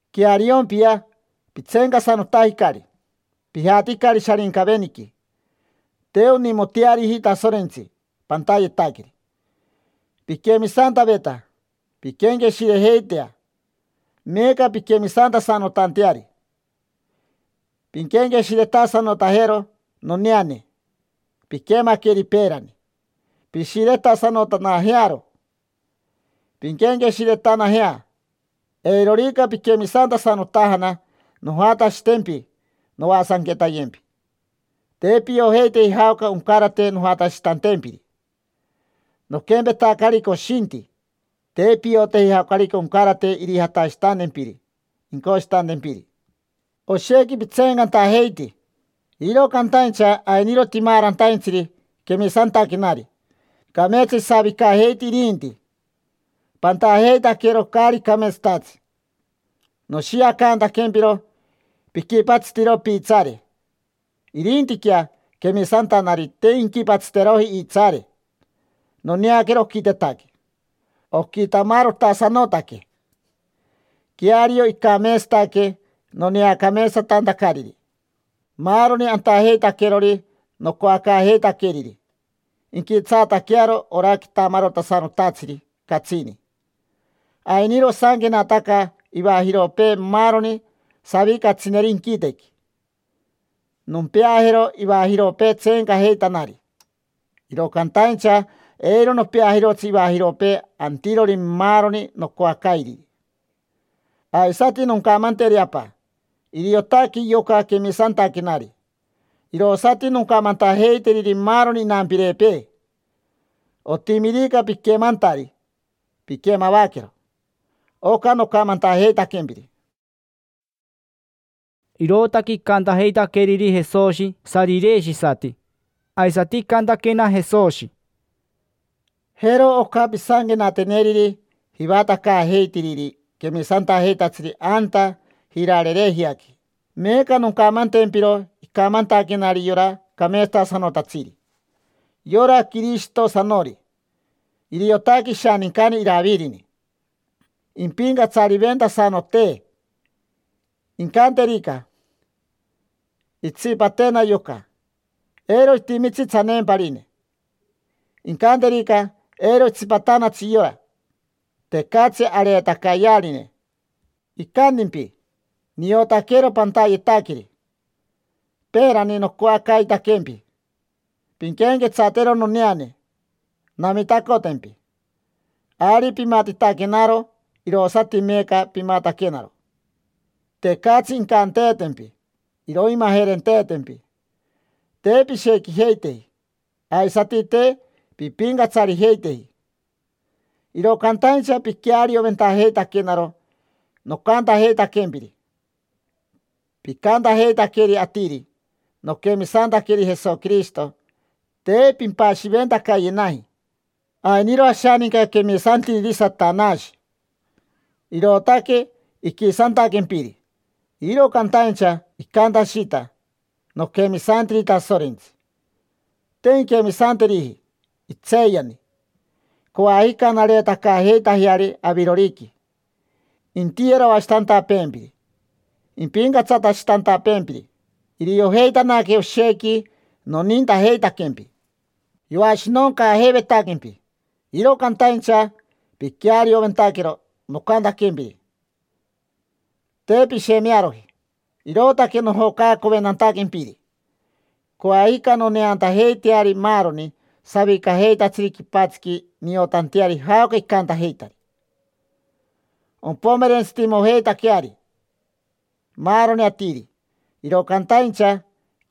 Queariompia, pitseencasanotajicari, pijaticari Sharincaveniqui. Te onimoteariji Tasorentsi pantayetaqueri. Piquemisantaveta: pinquenqueshirejeitea meeca pinquemisantasanotanteari. Pinquenqueshiretasanotanajero noneane piquemaqueri peerani: pishiretasanotanajearo, pinquenqueshiretanajea. Eirorica piquemisantasanotajana, nojatashitempi, noasanquetayempi. Te piojeiteji jaoca oncarate nojatashitantempiri: noquempetacari coshinti, te pioteji jaocarica oncarate irijatashitantempiri incoshitantempiri. Oshequi pitseencantajeiti, iro cantaincha ainiro timaarantaintsiri quemisantaquenari: cameetsa isavicajeiti irinti. Pantajeitaquero caari cameetsatatsi noshiacantaquempiro piquipatsitiro piitsaare; irintiquea quemisantanari, te inquipatsiteroji iitsaare; noneaquero oquitetaque, oquitamarotasanotaque. Queario icameetsataque noneacameetsatantacariri. Maaroni antajeitaquerori nocoacaajeitaqueriri inquitsaataquearo ora quitamarotasanotatsiri catsini. Ainiro osanquenataca ivajiropee maaroni savicatsineri inquitequi. Nompeajero ivajiropee tseencajeitanari, iro cantaincha eiro nopeajirotsi ivajiropee antirori maaroni nocoacairiri. Aisati noncamanteri Apa: “Iriotaque yoca quemisantaquenari”. Irosati noncamantajeiteriri maaroni inampirepee. Otimirica piquemantari, pinquemavaquero oca nocamantajeitaquempiri’”. Irootaque icantajeitaqueriri Jesoshi sarireshisati. Aisati icantaquena Jesoshi: —Jero oca pisanquenateneriri jivatacaajeitiriri quemisantajeitatsiri anta Jirarerejiaqui: “Meeca noncamantempiro icamantaquenari yora cameetsatasanotatsiri, yora Quirishitosanori. Iriotaque ishanincani Iravirini, impincatsariventasanotee. Incanterica: ‘Intsipatena yoca’, eiro itimitsi tsaneemparine. Incanterica: ‘Eiro itsipatanatsi yora’, tecatsi areetacayearine. Icantimpi: ‘Niotaquero pantayetaqueri. Peerani nocoacaitaquempi: “Pinquenquetsatero noneane, namitacotempi”. Ari pimatitaquenaro, irosati meeca pimataquenaro: tecatsi incanteetempi iroimajerenteetempi. Te pishequijeiteji, aisati te pimpincatsarijeiteji, iro cantaincha piquearioventajeitaquenaro nocantajeitaquempiri. Picantajeitaqueri atiri: “Noquemisantaqueri Jesoquirishito”, te pimpashiventacayenaji. Ainiro ashaninca quemisantiriri Satanashi, irootaque iquisantaquempiri, iro cantaincha icantashita: “Noquemisantiri Tasorentsi”. Te inquemisanteriji, itseeyani. Coajica nareetacaajeitajeari aviroriqui intiyeroashitantapeempiri, impincatsatashitantapeempiri: iriojeitanaque oshequi nonintajeitaquempi. Yoashinoncaajeivetaquempi, iro cantaincha piquearioventaquero nocantaquempiri, te pishemearoji, irootaque nojocaacoventantaquempiri. Coajica noneantajeiteari maaroni savicajeitatsiri quipatsiqui niotanteari jaoca icantajeita. Ompomerentsitimojeitaqueari maaroni atiri; iro cantaincha,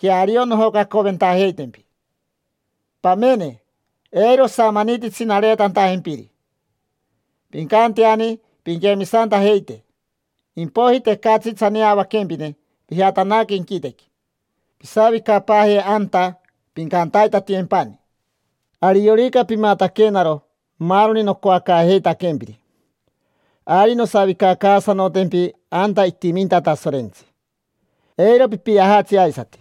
queario nojocaacoventajeitempi. Pamene, eiro osamanititsi nareetantajempiri. Pincanteani pinquemisantajeite, impoiji tecatsi tsaneavaquempine pijatanaque inquitequi; pisavicapaaje anta, pincantaitatiyempani. Ariorica pimataquenaro maaroni nocoacaajeitaquempiri, ari nosavicacaasanotempi anta itiminta Tasorentsi: eiro pipiajatsi aisati.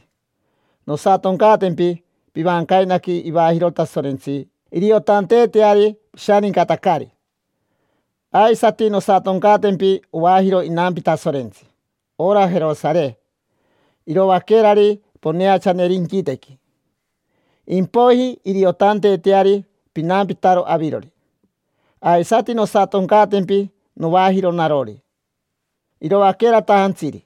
Nosatoncaatempi pivancainaqui ivajiro Tasorentsi iriotanteeteari pishanincatacari. Aisati nosatoncaatempi ovajiro inampi Tasorentsi: ora Jerosare iroaquerari poneachaneri inquitequi. Impoiji iriotanteeteari pinampitaro avirori. Aisati nosatoncaatempi novajiro narori, iroaqueratajantsiri,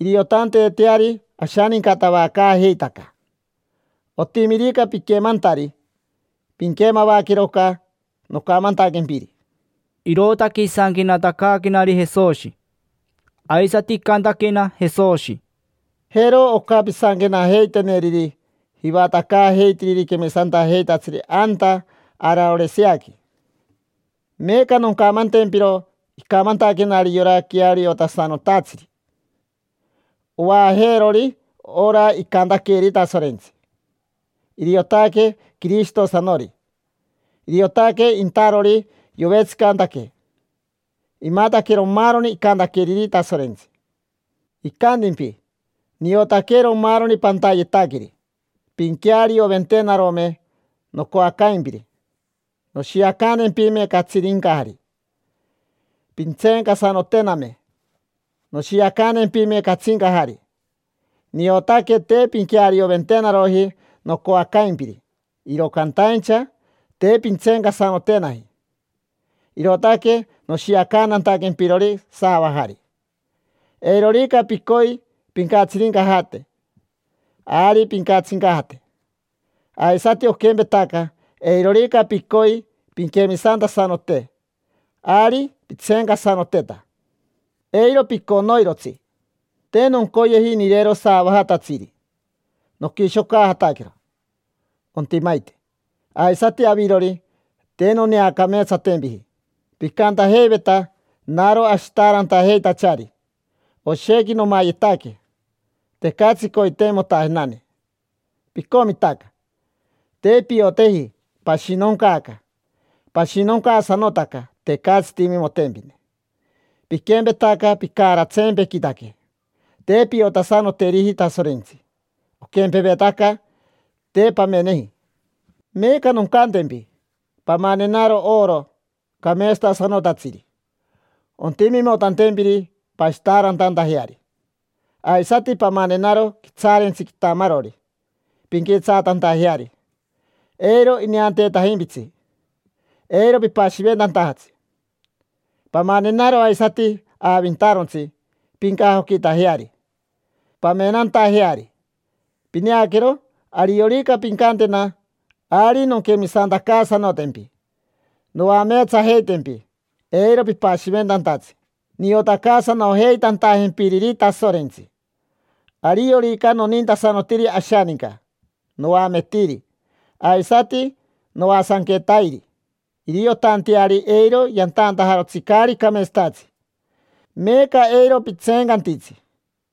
iriotanteeteari ashanincatavacaajeitaca. Otimirica piquemantari, pinquemavaquero oca nocamantaquempiri’”. Irootaque isanquenatacaaquenari Jesoshi. Aisati icantaquena Jesoshi: —Jero oca pisanquenajeiteneriri jivatacaajeitiriri quemisantajeitatsiri anta Araoriseaqui: “Meeca noncamantempiro icamantaquenari yora Queariotasanotatsiri, ovaajeerori ora icantaqueeri Tasorentsi: iriotaque Quirishitosanori. Iriotaque intarori yovetsicantaque: imataquero maaroni icantaqueriri Tasorentsi. Icantimpi: ‘Niotaquero maaroni pantayetaqueri. Pinquearioventenarome nocoacaimpiri, noshiacantempime catsirincajari; pintseencasanotename, noshiacantempime catsincajari. Niotaque te pinquearioventenaroji nocoacaimpiri, iro caintaincha te pintseencasanotenaji; irootaque noshiacantantaquempirori saavajari. Eirorica picoi pincatsirincajate, ari pincatsincajate; aisati oquempetaca, eirorica picoi pinquemisantasanote, ari pintseencasanoteta: eiro piconoirotsi. Te noncoyeji nirero saavajatatsiri: noquishocajataquero, ontimaite. Aisati avirori, te noneacameetsatempiji. Picantajeiveta: “Naro ashitaarantajeitachari, oshequi nomayetaque, tecatsi coiteimotajenane”. Picomitaca: te pioteji pashinoncaaca; pashinoncaasanotaca, tecatsi timimotempine, piquempetaca picaaratsempequitaque. Te piotasanoteriji Tasorentsi: oquempevetaca te pameneji. Meeca noncantempi: pamanenaro oro cameetsatasanotatsiri, ontimimotantempiri pashitaarantantajeari. Aisati pamanenaro quitsaarentsi quitamarori pinquitsaatantajeari eiro ineanteetajimpitsi, eiro pipashiventantajatsi. Pamanenaro aisati aavintarontsi pincajoquitajeari, pamenantajeari. Pineaquero, ariorica pincantena, ari nonquemisantacaasanotempi, noameetsajeitempi eiro pipashiventantatsi, niotacaasanojeitantajempiriri Tasorentsi. Ariorica nonintasanotiri ashaninca, noametiri, aisati noasanquetairi, iriotanteari eiro yantantajarotsi caari cameetsatatsi. Meeca eiro pitseencantitsi,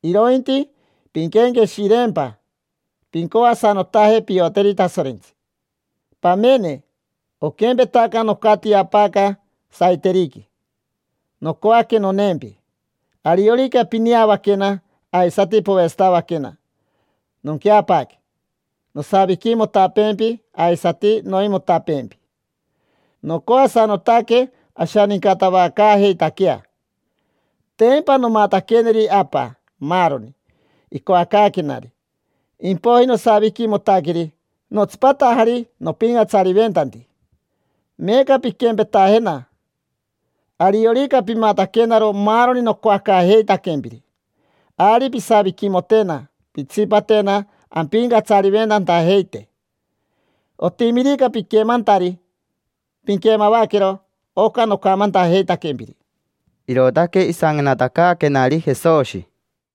irointi pinquenqueshireempa: pincoasanotaje pioteri Tasorentsi. Pamene, oquempetaca nocatiapaaca saiteriqui, nocoaque noneempi. Ariorica pineavaquena aisati povetsatavaquena, nonqueapaaque, nosaviquimotapeempi aisati noimotapeempi. Nocoasanotaque ashanincatavacaajeitaquea. Tempa nomataqueneri Apa maaroni icoacaaquenari, impoiji nosaviquimotaqueri, notsipatajari nopincatsariventanti. Meeca pinquempetajena: ariorica pimataquenaro maaroni nocoacaajeitaquempiri, ari pisaviquimotena pintsipatena ampincatsariventantajeite. Otimirica piquemantari, pinquemavaquero oca nocamantajeitaquempiri’”. Irootaque isanquenatacaaquenari Jesoshi.